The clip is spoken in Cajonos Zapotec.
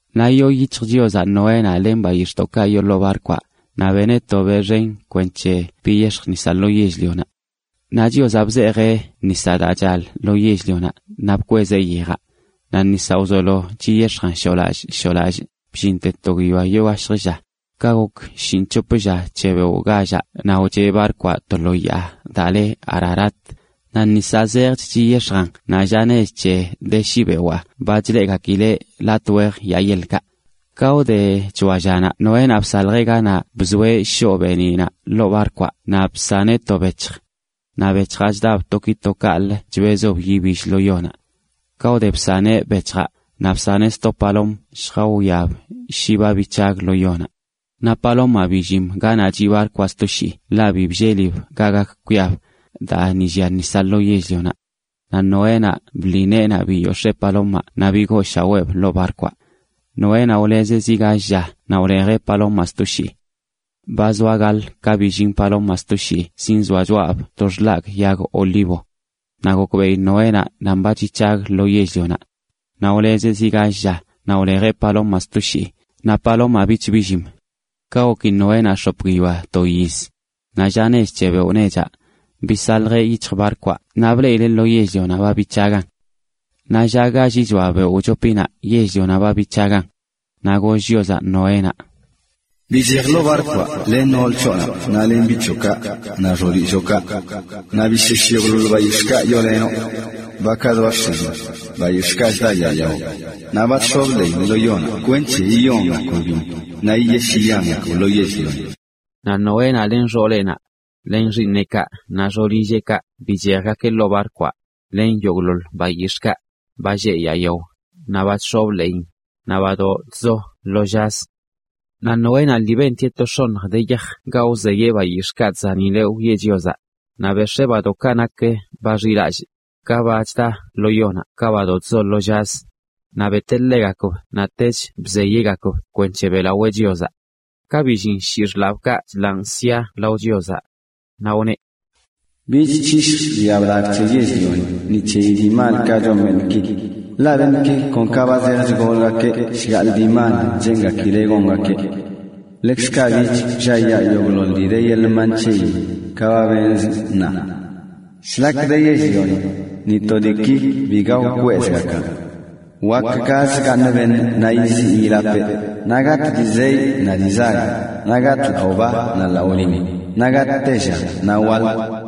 Naꞌ yoo yic̱hj Chiozaꞌ Noénaꞌ len bayix̱ꞌkaꞌ yoo lo barkwaꞌ, naꞌ beneꞌ to beꞌ xen kwenc̱he biyex̱j nisaꞌ lo yell-lionaꞌ. Naꞌ Chiozaꞌ bzeejeꞌ nisaꞌ daa chal ḻoo yell-lionaꞌ naꞌ bkwezeꞌ yejaꞌ. Naꞌ nisaꞌ wzolo chiyex̱jan shoolallꞌ shoolallꞌ, bllinte to guiyoa yoo gashjə lla. Ka gok shinꞌc̱hop lla c̱he beoꞌ gallaꞌ naꞌ wcheꞌ barkwaꞌ to lo yaa daa le Ararat. Naꞌ nisaꞌ zejch chiyex̱jan naꞌ lla nech c̱he de shi bewaa ba chileꞌgakileꞌ latꞌ wejə yaa yeḻkaꞌ. Ka wde c̱hoa llanaꞌ Noénaꞌ bsaljeꞌ ganaꞌ bzoeꞌ shoꞌ beeniꞌnaꞌ ḻoo barkwaꞌ naꞌ bsaneꞌ to bec̱hj. Naꞌ bec̱hjaꞌ chdab to ki to kaꞌlə chbezb yibill lo yonaꞌ. Ka wde bsaneꞌ bec̱hjaꞌ, naꞌ bsaneꞌ sto palom lljawiab shi ba bic̱hag lo yonaꞌ. Naꞌ palomaꞌ billim ganaꞌ chiꞌ barkwaꞌ stoshii ḻaꞌ bi bllelib ga gak kwiab, daa ni llia nisaꞌ lo yell-lionaꞌ. Naꞌ Noénaꞌ bḻi neenaꞌ biyox̱ee palomaꞌ naꞌ bigooshaweeb ḻoo barkwaꞌ. Noénaꞌ wlezeꞌ zi gall lla naꞌ wlejeꞌ palomaꞌ sto shii. Ba zoa gaḻ ka billin palomaꞌ sto shii zinzoa choꞌab to xḻagꞌ yag olivo. Naꞌ gokbeꞌi Noénaꞌ nan ba chic̱hag lo yell-lionaꞌ. Naꞌ wlezeꞌ zi gall lla, naꞌ wlejeꞌ palomaꞌ sto shii, naꞌ palomaꞌ bich billim. Ka goki Noénaꞌ x̱op guiyoa to yiz, naꞌ lla nech c̱he beoꞌ nechaꞌ, bisaljeꞌ yic̱hj barkwaꞌ naꞌ bleꞌileꞌ lo yell-lionaꞌ ba bic̱hagan. Naꞌ lla gallichoa beoꞌ wchopinaꞌ yell-lionaꞌ ba bic̱hagan. Naꞌ goll Chiozaꞌ Noénaꞌ: “Bichej ḻoo barkwaꞌ len nool c̱hoꞌnaꞌ len biꞌ c̱hoꞌkaꞌ, naꞌ xoolilloꞌkaꞌ. Naꞌ bishesh yogꞌḻoḻ bayix̱ꞌkaꞌ wyoolenoꞌ: bakaꞌ zoa x̱ilin, bayix̱ꞌkaꞌ chda yaa yao, naꞌ ba chx̱ob ḻeeyin lo yonaꞌ kwenc̱he yiyongakb biṉ naꞌ yiyesh yiyangakb lo yell-lioni.” Naꞌ Noénaꞌ len xooleꞌnaꞌ, len xiiṉeꞌkaꞌ naꞌ xoolilleꞌkaꞌ bichejgakeꞌ ḻoo barkwaꞌ, len yogꞌḻoḻ bayix̱ꞌkaꞌ: ba lleꞌ yaa yao, naꞌ ba chx̱obə ḻeeyin, naꞌ badoꞌ chzo lo llazə. Naꞌ Noénaꞌ lii bentieꞌ to x̱oṉj de yaj ga wzeyeꞌ bayix̱ꞌkaꞌ chzanileꞌ wiꞌe Chiozaꞌ. Naꞌ bex̱ee badoꞌkaꞌ nak ba xilallꞌ, ka ba chda lo yonaꞌ ka badoꞌ chzo lo llazə, naꞌ beteꞌ ḻegakb naꞌ tech bzeyeꞌgakb kwenc̱he beꞌlawee Chiozaꞌ. Ka billin shii xḻaabkaꞌ chḻaan sia lao Chiozaꞌ. Naꞌ wneꞌ: “Bich c̱hishj biaꞌ blagꞌ c̱he yell-lioni ni c̱heyi dii malkaꞌ chon beṉꞌki, ḻaꞌ beṉꞌki kon ka ba zej chgolgakeꞌ shgaꞌḻ dii mal cheengakileꞌ gongakeꞌ. Ḻekzkaꞌ bich wlliayaa yogꞌḻoḻ dii de yeḻꞌ mban c̱heyin, ka ba benzꞌ ṉaa. “Shlak de yell-lioni, ni to diiki biga wkwezꞌgakan, wakə gaz gaaṉ beṉꞌ naꞌ yiziꞌ yilapeꞌ, naꞌ gatꞌ dii zeyꞌ naꞌ dii zag, naꞌ gatꞌ laꞌo ba naꞌ laꞌo lin, naꞌ gatꞌ tella naꞌ waḻ.”